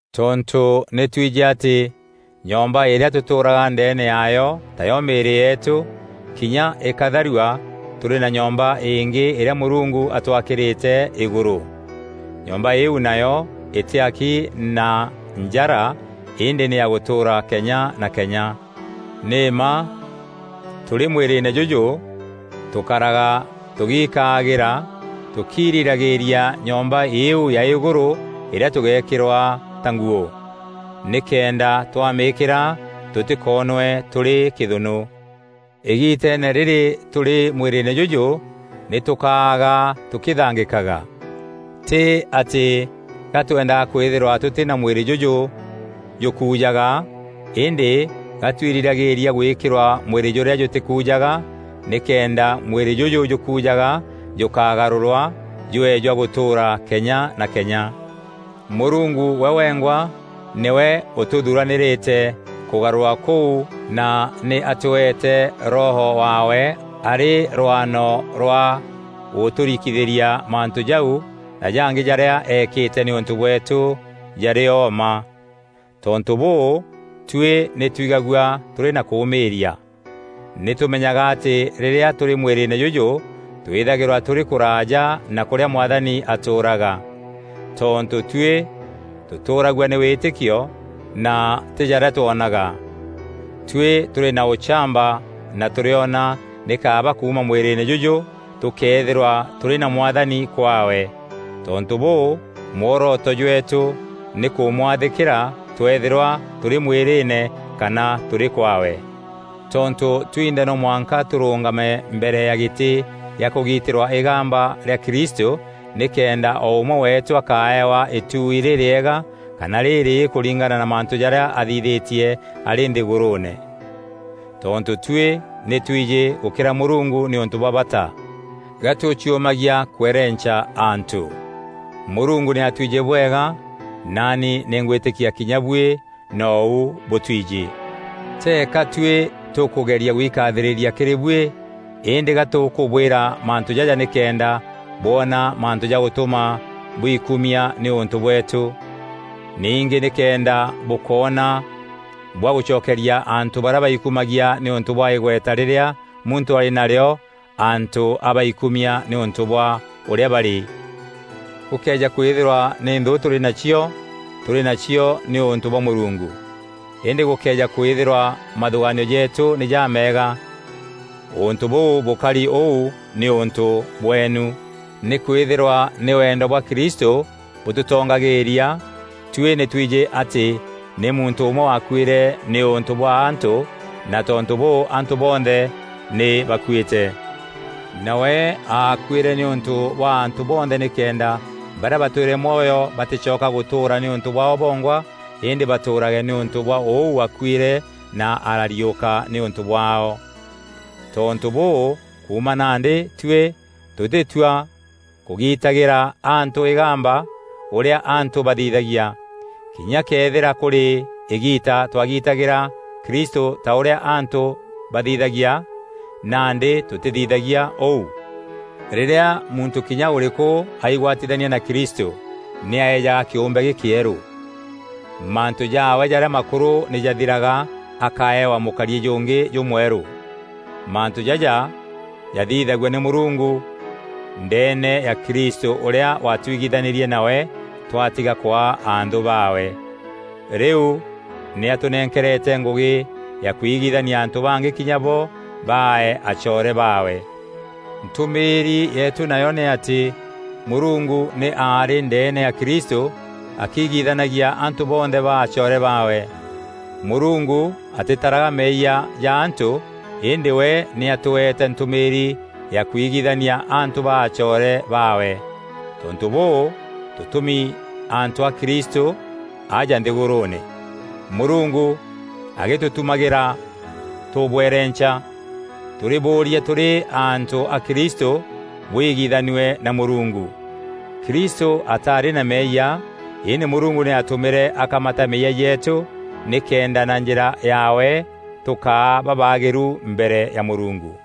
Tontû nî twijî atî nyomba îrîa tûtûûraga ndeene yaayo tayo mîîrî yeetû, kinya îkatharua, tûrî na nyomba îngî îrîa Mûrungu atwakîrîte îgûrû. Nyomba îîu nayo îtîaki na njara îndî nî ya gûtûûra kenya na kenya. Nî mma tûrî mwîrîîne jûjû tûkaraga tûgiikaagîra tûkiirîragîîria nyomba îîu ya îgûrû îrîa tûgekîrwa ta nguû, nîkenda twamîîkîra tûtîkoonwe tûrî kîthûnû. Îgiteene rîrî tûrî mwîrîîne jûjû, nî tûkaaga tûkîthangîkaga; tî atî ga twendaga kwîthîrwa tûtî na mwîrî jûjû jûkujaga, îndî ga twirîragîîria gwîkîrwa mwîrî jûrîa jûtîkujaga, nîkenda mwîrî jûjû jûkujaga jûkagarûrwa jwee jwa gûtûûra kenya na kenya. Mûrungu we wengwa nîwe ûtûthuranîrîte kûgarûrwa kûu na nî atweete Roho waawe arî rwano rwa gûtûrikithîria mantû jau na jangî jarîa eekîte nîûntû bweetû jarîo mma. Tontû bûû, tuî nî twigagua tûrî na kûmîîria. Nîtûmenyaga atî rîrîa tûrî mwîrîîne jûjû twîthagîrwa tûrî kûraaja na kûrîa Mwathani atûûraga. Tontû tuî tûtûragua nî wîtîkio na tî jarîa twonaga. Tuî tûrî na ûchamba na tûrîona nî kaaba kuuma mwîrîîne jûjû tûkeethîrwa tûrî na Mwathani kwaawe. Tontû bûû, mworoto jweetû nî kûmwathîkîra tweethîrwa tûrî mwîrîîne kana tûrî kwaawe. Tontû twinthe no mwanka tûrûûngame mbere ya gîtî gîa kûgitîrwa îgamba rîa Kristû, nîkenda o ûmwe weetû akaewa îtuui rîrîega kana rîrîî kûringana na mantû jarîa athithîtie arî nthîgûrûûne. Tontû tuî nî twijî gûkîra Mûrungu nî ûntû bwa bata, ga tûciûmagia kwerenca antû. Mûrungu nî atwijî bwega, naani nî ngwîtîkia kinya buî nou bûtwijî. Teeka tuî tûkûgeria gwikathîrîria kîrî buî, îndî ga tûkûbwîra mantû jaja nîkenda bwona mantû ja gûtûma bwikumia nîûntû bweetû. Ningî nîkenda bûkoona bwa gûcokeria antû barîa baikumagia nîûntû bwa îgweta rîrîa muntû arî narîo antû a baikumia nîûntû bwa ûrîa barî. Gûkëeja kwîthîrwa nî nthû tûrî nacio, tûrî nacio nîûntû bwa Mûrungu; îndî gûkëeja kwîthîrwa mathûgaanio jeetû nî jameega, ûntû bûu bûkari ûu nîûntû bweenu. Nîkwîthîrwa nî wendo bwa Kristû bûtûtongagîîria, tuî nî twijî atî nî muntû ûmwe waakuîre nîûntû bwa antû na tontû bûû antû bonthe nî bakuîte. Nawe aakuîre nîûntû bwa antû bonthe nîkenda barîa batwîre mwoyo batîcoka gûtûûra nîûntû bwaao bongwa îndî batûûrage nîûntû bwa ûu waakuîre na arariûka nîûntû bwaao. Tontû bûû, kuuma nandî tuî, tûtîtua kûgitagîra antû îgamba ûrîa antû bathithagia. Kinya këethîra kûrî îgiita twagitagîra Kristû ta ûrîa antû bathithagia, nandî tûtîthithagia ûu. Rîrîa muntû kinya ûrîkû aigwatithania na Kristû, nî aejaga kîûmbe gîkîerû. Mantû jaawe jarîa makûrû nî jathiraga akaeewa mûkariî jûngî jûmwerû. Mantû jaja jathithagua nî Mûrungu ndeene ya Kristû ûrîa watwigithanîrie nawe twatiga kwaa anthû baawe. Rîu nî atûnenkerete ngûgî ya kwigithania antû bangî kinya bo baae acoore baawe. Ntûmîîri yeetû nayo nî atî Mûrungu nî aarî ndeene ya Kristû akigithanagia antû bonthe baa acoore baawe. Mûrungu atîtaraga meeyia ja antû îndî we nî atweete ntûmîîri ya kwigithania antû baa acoore baawe. Tontû bûû, tûtûmi antû a Kristû aja nthîgûrûûne, Mûrungu agîtûtumagîra tûbwerenca. Tûrîbûûria tûrî antû a Kristû bwigithanue na Mûrungu. Kristû ataarî na meeyia, îndî Mûrungu nî aatûmîre akamata meeyia jeetû, nîkenda na njîra yaawe tûkaa babaagîru mbere ya Mûrungu.